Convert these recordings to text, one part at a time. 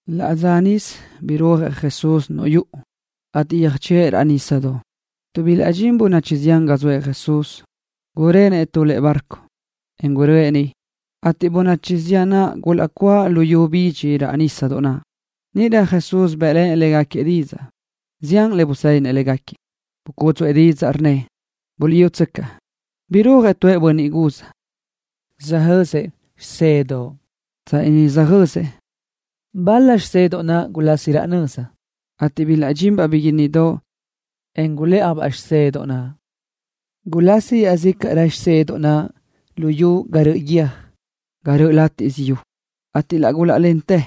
Laʼ dza níʼisö birúajëʼ Jesús niuʼ yuʼu, ateʼ yöjchöʼë raʼ nísadoʼ. Tuʼ bilaʼdxín bönachi zián ga zoëʼ Jesús, gurenëʼ tu lëʼe bárcodoʼ, en guröʼë niʼ, ateʼ bönachi zián naʼ gulaʼcuáʼ luyú bidxi raʼ nísadoʼ naʼ. Níʼirö Jesús bë́ʼlenëʼ légaquiëʼ didzaʼ, zián le busédinëʼ légaquiëʼ. Bucúdzuʼë didzaʼ, rnnëʼ: —Buliʼyútsöcaʼ, birúajëʼ tu bönniʼ guz, söjë́siëʼ xisedoʼ. Tsanni niʼ söjë́siëʼ, bal-la xisedoʼ naʼ gulasi raʼ nöza, ateʼ bilaʼdxinbaʼ biguínnidoʼ, en gulë́ʼajbaʼ xisedoʼ naʼ. Gulasi iaʼzícaʼrö xisedoʼ naʼ luyú ga röʼö guiö́j, ga naʼ röʼö látiʼsö yu, ateʼ laʼ gulaʼlentë,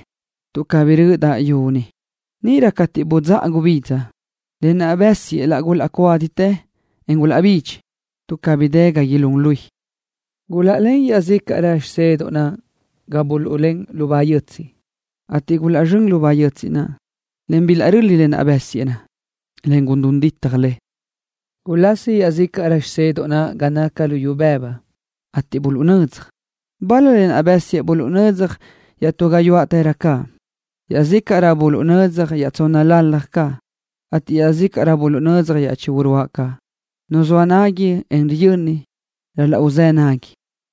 tuʼ cabí rö́ʼödaʼ yu niʼ. Níʼirö cateʼ budzáʼa gubidza, lë naʼ bësiëʼ laʼ gulaʼcuáditë, en gulaʼbidxi, tuʼ cabí dë ga ilún luí. Gulaʼlén iaʼzícaʼrö xisedoʼ naʼ ga buluʼlén lubá yötsiʼ, ateʼ gulaʼzxö́n lubá yötsiʼ naʼ, en bilaʼröli lë naʼ bësiëʼ, en gulún ditaj le. Gulasi iaʼzícaʼrö xisedoʼ naʼ ga naca luyú bëbu, ateʼ buluʼnödzaj. Bal-la lë naʼ bësiëʼ buluʼnödzaj iaʼtú gayuáʼtërö caʼ. Iaʼzícaʼrö buluʼnödzaj iaʼtsónnalalaj caʼ, ateʼ iaʼzícaʼrö buluʼnödzaj iaʼchí uruáʼ caʼ. Nu zoa nagui, en riyöni, ral-laʼ uzë́ nagui.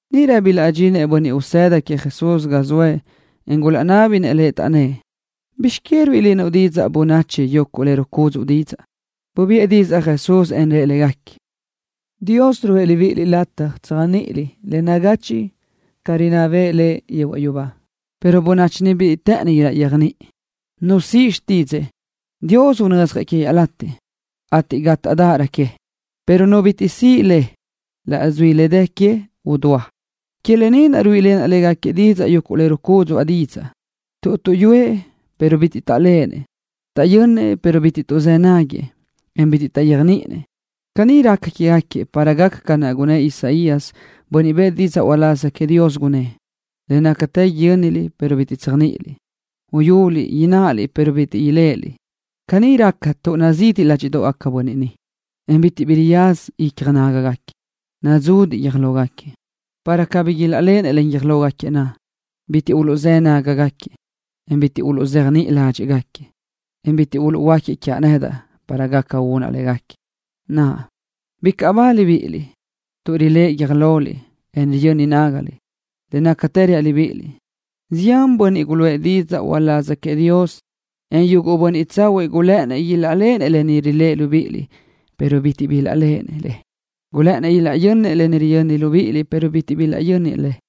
Níʼirö bilaʼdxinëʼ bönniʼ usëda queëʼ Jesús ga zoëʼ, en gulaʼnábinëʼ Lëʼ, taʼnnë́ʼ: —¿Bizx que ruíʼilenuʼ bönachi didzaʼ yuguʼ le rucúdzuʼu didzaʼ? Bubiʼë didzaʼ Jesús, en rëʼ légaquiëʼ: —Dios ruʼë libíʼiliʼ lataj tséajniʼiliʼ le nagachiʼ ca rinná bëʼë Lëʼ yehuaʼ yubá, pero bönachi ni bitiʼ të́ʼëni ilaʼyéajniʼi. Nu siʼ xtídzëʼë, Dios unödzjëʼ que iaʼlatiʼ, ateʼ gátaʼdaʼarö que, pero nu bitiʼ siʼ le, laʼs dui le dë que udúa. Que lë ni naʼ ruíʼilenaʼ légaquiëʼ didzaʼ yuguʼ le rucúdzuʼa didzaʼ, tuʼ tuʼyúëʼ pero bitiʼ taʼléʼenëʼ. Taʼyönnëʼ pero bitiʼ tuʼzë́ nágagaquiëʼ, en bitiʼ taʼyéajniʼinëʼ. Caní raca quégaquiëʼ para gaca ca naʼ gunnë́ʼ Isaías, bönniʼ bëʼë didzaʼ uláz queëʼ Dios, gunnë́ʼ: Le nácatë yö́niliʼ pero bitiʼ tséajniʼiliʼ. Uyuliʼ ináʼaliʼ pero bitiʼ iléʼeliʼ. Caní raca tuʼ nazidi ládxiʼdoʼgaca bönniʼ ni, en bitiʼ bi riyaza icja nágagaquiëʼ. Nadzudiʼ guiö́j lógaquiëʼ, para cabí ilaʼléʼenëʼ len guiö́j lógaquiëʼ naʼ. Bitiʼ uluʼzë́ nágagaquiëʼ, en bitiʼ uluʼzéajniʼi ládxiʼgaquiëʼ, en bitiʼ uluʼhuöáquiëʼ quiaʼ nedaʼ para gaca unaʼ légaquiëʼ. ’Naʼa, bicaʼ ba libíʼiliʼ, tuʼ riléʼe guiö́j loliʼ, en riyöni nágaliʼ. Le nácatë reaʼ libíʼiliʼ, zián bönniʼ guluʼë didzaʼ uláz queëʼ Dios en yuguʼ bönniʼ tsahuiʼ gulë́ʼënnëʼ ilaʼléʼenëʼ le riléʼeliʼ libíʼiliʼ pero bitiʼ bilaʼléʼenëʼ le. Gulë́ʼënnëʼ ilaʼyönnëʼ le riyö́niliʼ libíʼiliʼ pero bitiʼ bilaʼyönnëʼ le.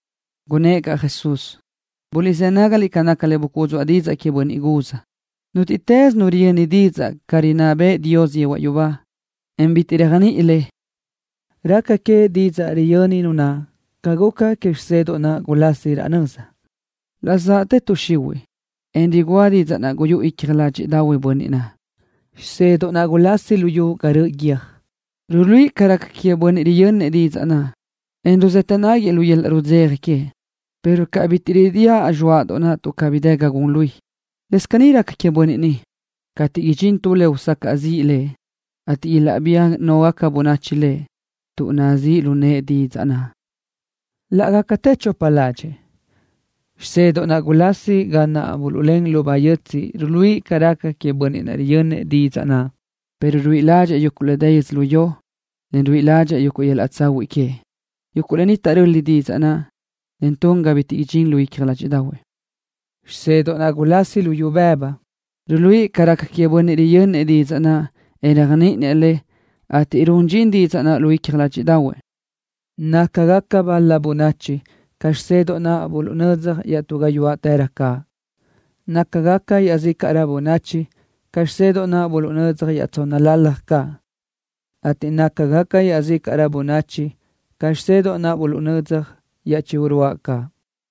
Gunnë́ʼ caʼ Jesús: —Buliʼzë́ nágaliʼ ca naca le bucúdzuʼa didzaʼ que bönniʼ guz. Nútiʼtës nu riyöni didzaʼ ca rinná bëʼë Dios yehuaʼ yubá, en bitiʼ réajniʼi le, raca que didzaʼ riyöni nu naʼ ca guca que xisedoʼ naʼ gulasi raʼ nöza. Laʼ zaʼtë tuʼ xihuiʼ, en rugúa didzaʼ naʼ guyúʼu icja ládxiʼdaʼahuëʼ bönniʼ naʼ. Xisedoʼ naʼ gulasi luyú ga röʼö guiö́j ruluíʼi ca raca queëʼ bönniʼ riyönnëʼ didzaʼ naʼ, en laʼ ruzëtë náguiëʼ lu yöl-laʼ rudzeja queëʼ, pero ca naʼ bitiʼ ridíaʼ xisedoʼ naʼ tuʼ cabí dë ga gun luí, lëscaʼ caní raca queëʼ bönniʼ ni. Cateʼ idxín tu le usacaʼ ziʼ lëʼ, ateʼ ilaʼbía náʼgaca bönachi lëʼ tuʼ nazíʼ lu nëʼë didzaʼ naʼ, laʼ gácatë chopa ládxëʼë. Xisedoʼ naʼ gulasi ga naʼ buluʼlén lubá yötsiʼ ruluíʼi ca raca queëʼ bönniʼ naʼ riyönnëʼ didzaʼ naʼ, pero ruíʼi ládxëʼë yuguʼ le dë yödzölió ni, ateʼ nazíʼ yëʼë bönniʼ naʼ, tuʼ ruíʼi ládxëʼë yuguʼ yöl-laʼ tsahuiʼ que. Yuguʼ lë ni taʼröli didzaʼ naʼ, en tun ga bitiʼ gun dxin lu icja ládxiʼdaʼahuëʼ. Xisedoʼ naʼ gulasi luyú bëbu ruluíʼi ca raca queëʼ bönniʼ riyönnëʼ didzaʼ naʼ, en réajniʼinëʼ le, ateʼ run dxin didzaʼ naʼ lu icja ládxiʼdaʼahuëʼ. Nácagaca bal-la bönachi ca xisedoʼ naʼ buluʼnödzaj iaʼtú gayuáʼtërö caʼ. Nácagaca iaʼzícaʼrö bönachi ca xisedoʼ naʼ buluʼnödzaj iaʼtsónnalalaj caʼ, ateʼ nácagaca iaʼzícaʼrö bönachi ca xisedoʼ naʼ buluʼnödzaj iaʼchí uruáʼ caʼ.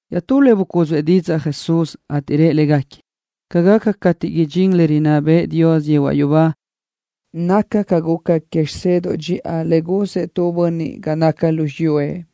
Iaʼtú le bucúdzuʼë didzaʼ Jesús, ateʼ rëʼ légaquiëʼ: —Ca gaca cate idxín ni le rinná bëʼë Dios yehuaʼ yubá naca ca guca que xisedoʼ dxiʼa le guzëʼ tu bönniʼ ga naca lu xiyúëʼ.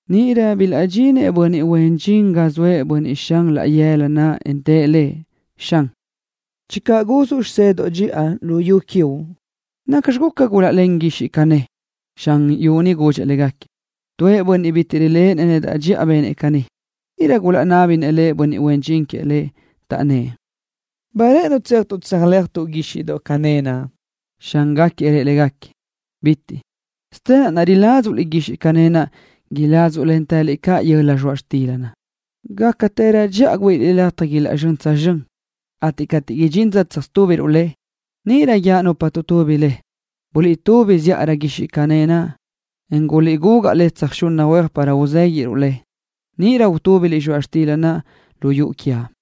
Níʼirö bilaʼdxinëʼ bönniʼ huen dxin ga zoëʼ bönniʼ xan laʼ yëla naʼ, en tëʼ lëʼ: “Xan, channö guzuʼ xisedoʼ dxiʼa lu yu quiuʼ, ¿nacxi guca gulaʼlén guíxiʼdoʼ cané naʼ?” Xan yu naʼ gudxëʼ légaquiëʼ, rnnëʼ: “Tu bönniʼ bitiʼ riléʼenëʼ nedaʼ dxiʼa benëʼ caní.” Níʼirö gulaʼnábinëʼ huen dxin queëʼ lëʼ, taʼnnë́ʼ: “¿Ba rë́ʼënuʼ tséajtuʼ tsöjö́lajtuʼ guíxiʼdoʼ cané naʼ?” Xángaquiëʼ rëʼ légaquiëʼ: “¡Bitiʼ caʼ! Nadx caʼ cateʼ iládzuʼliʼ guíxiʼdoʼ cané naʼ, iládzuʼlentëliʼ caʼ yöla zxoaʼ xtila. Gácarö dxiʼa güíʼiliʼ lataj ilaʼzxö́ngarö tsözxö́n cateʼ idxinrö dza tsöjtúbiruʼ le, ateʼ níʼirö guíaʼ nupa uluʼtubi le: Buliʼtubi zíʼalö guíxiʼdoʼ cané naʼ, en guliʼgugaʼ tsöjxili huéaj para uzéguiʼruʼ le, ateʼ níʼirö utúbiliʼ zxoaʼ xtila lu yuʼu quiaʼ.”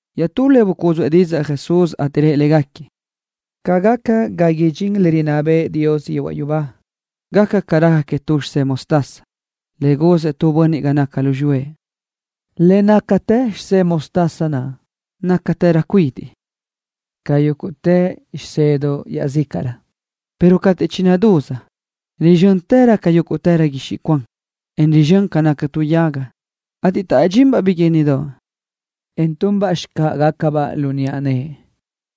Iaʼtú le bucúdzuʼë didzaʼ Jesús, ateʼ rëʼ légaquiëʼ: —Ca gaca ga idxín le rinná bëʼë Dios yehuaʼ yubá, gaca ca raca que tu xisé mostaza, le guzëʼ tu bönniʼ ga naca lu xiyúëʼ. Le nácatë xisé mostaza naʼ nácatërö cuidiʼ ca yúguʼtë xisedoʼ iaʼzícaʼrö, pero cateʼ chinadúz, rizxö́ntërö ca yúguʼtë guixiʼ cuan, en rizxö́n ca naca tu yaga, ateʼ taʼdxinbaʼ biguínnidoʼ, en tunbaʼ xicáʼagacabaʼ lu niʼa nëʼe.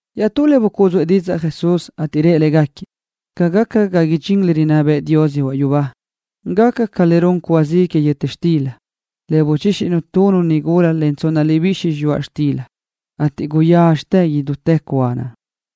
Iaʼtú le bucúdzuʼë didzaʼ Jesús, ateʼ rëʼ légaquiëʼ: —Ca gaca ga idxín le rinná bëʼë Dios yehuaʼ yubá gaca ca le run cúa zi que yöta xtila, le buchíxinu tu nigula len tsonna libixi yöjza zxoaʼ xtila, ateʼ guyazxa idútë cúa naʼ.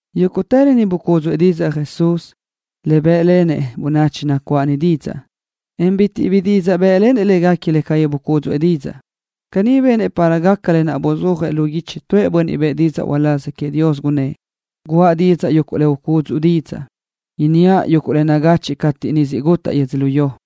Yúguʼtë lë ni bucúdzuʼë didzaʼ Jesús, le bë́ʼlenëʼ bönachi nacuáʼ niʼ didzaʼ, en bitiʼ bi didzaʼ bë́ʼlenëʼ légaquiëʼ le cabí bucúdzuʼë didzaʼ. Caní benëʼ para gaca lë naʼ buzúajëʼ lu guichi tu bönniʼ bëʼë didzaʼ uláz queëʼ Dios, gunnë́ʼ: Guʼa didzaʼ yuguʼ le ucúdzuʼa didzaʼ. Inníaʼ yuguʼ le nagachiʼ cateʼ niʼ gusí lo siʼ gutaʼ yödzölió.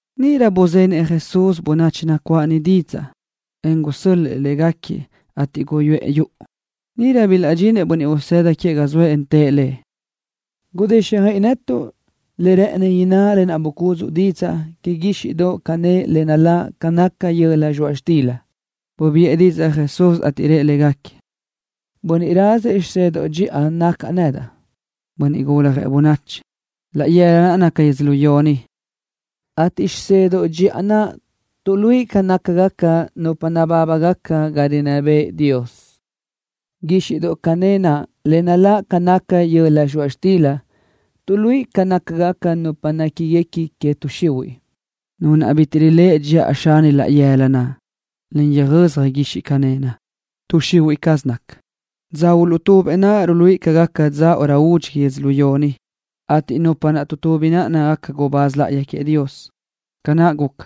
Níʼirö buzenëʼ Jesús bönachi nacuáʼ niʼ didzaʼ, en gusö́l-lëʼë légaquiëʼ, ateʼ guyuʼë yuʼu. Níʼirö bilaʼdxinëʼ bönniʼ usëda queëʼ ga zoëʼ, en tëʼ Lëʼ: —Gudíxjöiʼi netuʼ le rë́ʼëni inná lë naʼ bucúdzuʼu didzaʼ que guíxiʼdoʼ cané le naláʼ ca naca yöla zxoaʼ xtila. Bubiʼë didzaʼ Jesús, ateʼ rëʼ légaquiëʼ: —Bönniʼ razëʼ xisedoʼ dxiʼa nacaʼ nedaʼ, Bönniʼ Guljëʼ Bönachi. Laʼ yëla naʼ naca yödzölió ni, ateʼ xisedoʼ dxiʼa naʼ tuʼluíʼi ca nácagaca nupa nabábagaca ga rinná bëʼë Dios. Guíxiʼdoʼ cané naʼ le naláʼ ca naca yöla zxoaʼ xtila tuʼluíʼi ca nácagaca nupa néquiguequi que tuʼ xihuiʼ. Nu naʼ bitiʼ riléʼe dxiʼa xan laʼ yëla naʼ, en yöjöza guíxiʼdoʼ cané naʼ, tuʼ xihuiʼ caz naca. Dza uluʼtubëʼ naʼ ruluíʼi ca gaca dza údxi que yödzölió ni, ateʼ nupa naʼ tuʼtubi nácagaca gubáz láʼayi queëʼ Dios. Ca naʼ guca,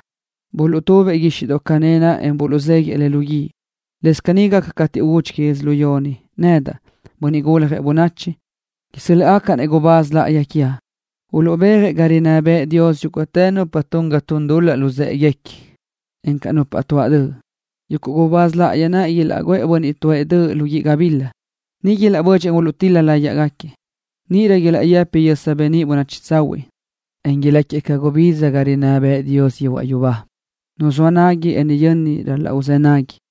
buluʼtubëʼ guíxiʼdoʼ cané naʼ, en buluʼzéguiʼë le lu guíʼ, lëscaʼ caní gaca cateʼ údxi que yödzölió ni. Nedaʼ, Bönniʼ Guljëʼ Bönachi, isö́l-laʼgacaʼ-nëʼ gubáz láʼayi quiaʼ, ateʼ uluʼbéajëʼ ga rinná bëʼë Dios yúguʼtë nupa tun ga tun dul-laʼ luzë́ʼeguequi, encaʼ nupa tuáʼ döʼ. Yuguʼ gubáz láʼayi naʼ ilaʼguʼë bönniʼ tuáʼ döʼ naʼ lu guíʼ gabila. Niʼ ilaʼbödxëʼ, en uluʼtíl-la láyiʼgaquiëʼ. Níʼirö ilaʼyëpi yösa beníʼ bönachi tsahuiʼ, en ilácagaquiëʼ ca gubidza ga niʼ rinná bëʼë Dios yehuaʼ yubá. Nu zoa nagui, en riyöni ral-laʼ uzë́ nagui.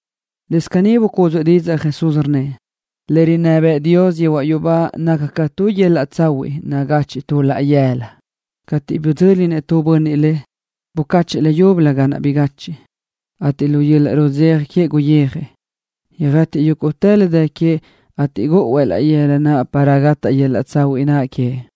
Lëscaʼ caní bucúdzuʼë didzaʼ Jesús, rnnëʼ: —Le rinná bëʼë Dios yehuaʼ yubá naca ca tu yöl-laʼ tsahuiʼ nagachiʼ tu laʼ yëla. Cateʼ bidzö́linëʼ tu bönniʼ le, bucáchëʼë le leyúbölö ga naʼ bigachiʼ, ateʼ lu yöl-laʼ rudzeja queëʼ guyijëʼ, yöjë́tiʼë yúguʼtë le dë queëʼ ateʼ gúʼuëʼ laʼ yëla naʼ para gataʼ yöl-laʼ tsahuiʼ naʼ queëʼ.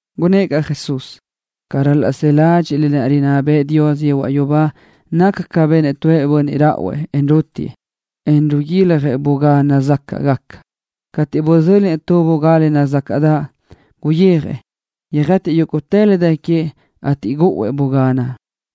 Gunnë́ʼ caʼ Jesús: —Ca ral-laʼ së ládxiʼliʼ le rinná bëʼë Dios yehuaʼ yubá naca ca benëʼ tu bönniʼ ráʼuëʼ, en ruútiʼë, en riguiljëʼ bugá nazácaʼgaca. Cateʼ bidzö́linëʼ tu bugá le nazácaʼdaʼ, guyijëʼ, yöjë́tiʼë yúguʼtë le dë queëʼ, ateʼ gúʼuëʼ bugá naʼ.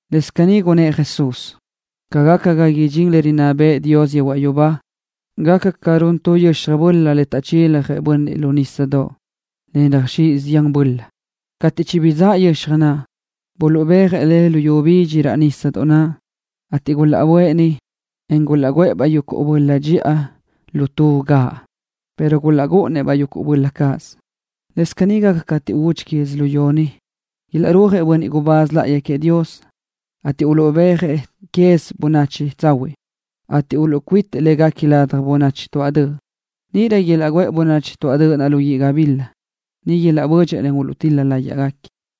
Lëscaʼ caní gunnë́ʼ Jesús: —Ca gaca ga ridxín le rinná bëʼë Dios yehuaʼ yubá, gaca ca run tu yöxaj böla le taʼchiljëʼ bönniʼ lu nísadoʼ, le röjxíʼ zián böla izáʼa. Cateʼ chibidzáʼ yöxaj naʼ, buluʼbéajëʼ le luyú bidxi raʼ nísadoʼ naʼ, ateʼ gulaʼböʼë niʼ, en gulaʼguʼë-baʼ yuguʼ böla dxiʼa tu lu gaʼböra, pero gulaʼrúʼunëʼ-baʼ yuguʼ böla cáʼasö. Lëscaʼ caní gaca cateʼ údxi que yödzölió ni. Ilaʼrúajëʼ gubáz láʼayi queëʼ Dios, ateʼ uluʼbéajëʼ quez yuguʼ bönachi tsahuiʼ, ateʼ uluʼcuítiëʼ légaquiëʼ ladaj bönachi tuáʼ döʼ. ’Níʼirö ilaʼguʼë bönachi tuáʼ döʼ naʼ lu guíʼ gabila. Niʼ ilaʼbödxëʼ, en uluʼtíl-la láyëʼë.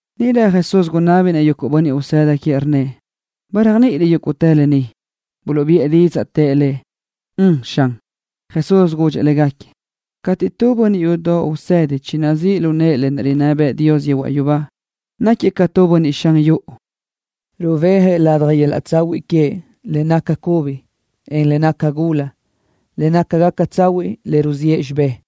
Níʼirö Jesús gunábinëʼ yuguʼ bönniʼ usëda queëʼ, rnnëʼ: —¿Ba réajniʼiliʼ yúguʼtë lë ni? Buluʼbiʼë didzaʼ, tëʼ Lëʼ: —Ön, Xan. Jesús gudxëʼ légaquiëʼ: —Cateʼ tu bönniʼ yudoʼ usedi chinazíʼ lu nëʼë le rinná bëʼë Dios yehuaʼ yubá, náquiëʼ ca tu bönniʼ xan yuʼu, rubéajëʼ ladaj yöl-laʼ tsahuiʼ queëʼ le naca cubi, en le naca gula, le nácagaca tsahuiʼ le ruziʼë xibé.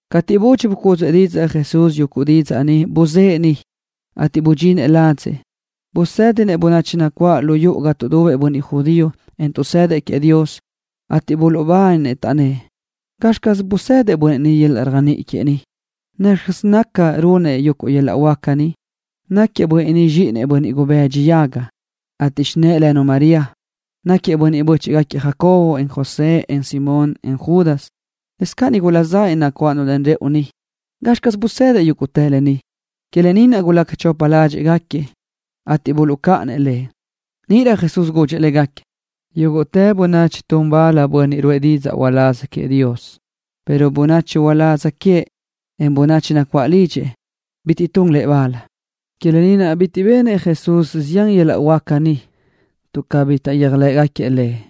Cateʼ budxi bucúdzuʼë Jesús yuguʼ didzaʼ ni, buzë́ʼë niʼ. Cateʼ budxinëʼ ladzëʼ, busédinëʼ bönachi nacuáʼ lu yuʼu ga tuʼdubëʼ bönniʼ judío, en tuʼsëdëʼ queëʼ Dios, ateʼ buluʼbáninë, taʼnnë́ʼ: —¿Gazxi caz guzëdëʼ bönniʼ ni yöl-laʼ réajniʼi ni? ¿Nacxi caz naca, runëʼ yuguʼ yöl-laʼ huáca ni? Náquiëʼ bönniʼ ni zxíʼinëʼ bönniʼ gubëdxi yaga, ateʼ xinë́ʼë lënu María. Náquiëʼ bö́chiʼgaquiëʼ Jacobo, en José, en Simón, en Judas. Lëscaʼ nigula zanëʼ nacuáʼlennu rëʼu ni. ¿Gazxi caz guzëdëʼ yúguʼtë lë ni? Que lë ni naʼ gulaca chopa ládxiʼgaquiëʼ, ateʼ buluʼcáʼanëʼ Lëʼ. Níʼirö Jesús gudxëʼ légaquiëʼ: —Yúguʼtë bönachi tun bal tu bönniʼ ruʼë didzaʼ uláz queëʼ Dios, pero bönachi uládz queëʼ, en bönachi nacuáʼ lidxëʼ bitiʼ tun lëʼ bal. Que lë ni naʼ bitiʼ benëʼ Jesús zián yöl-laʼ huáca niʼ, tuʼ cabí taʼyéajlëʼë Lëʼ.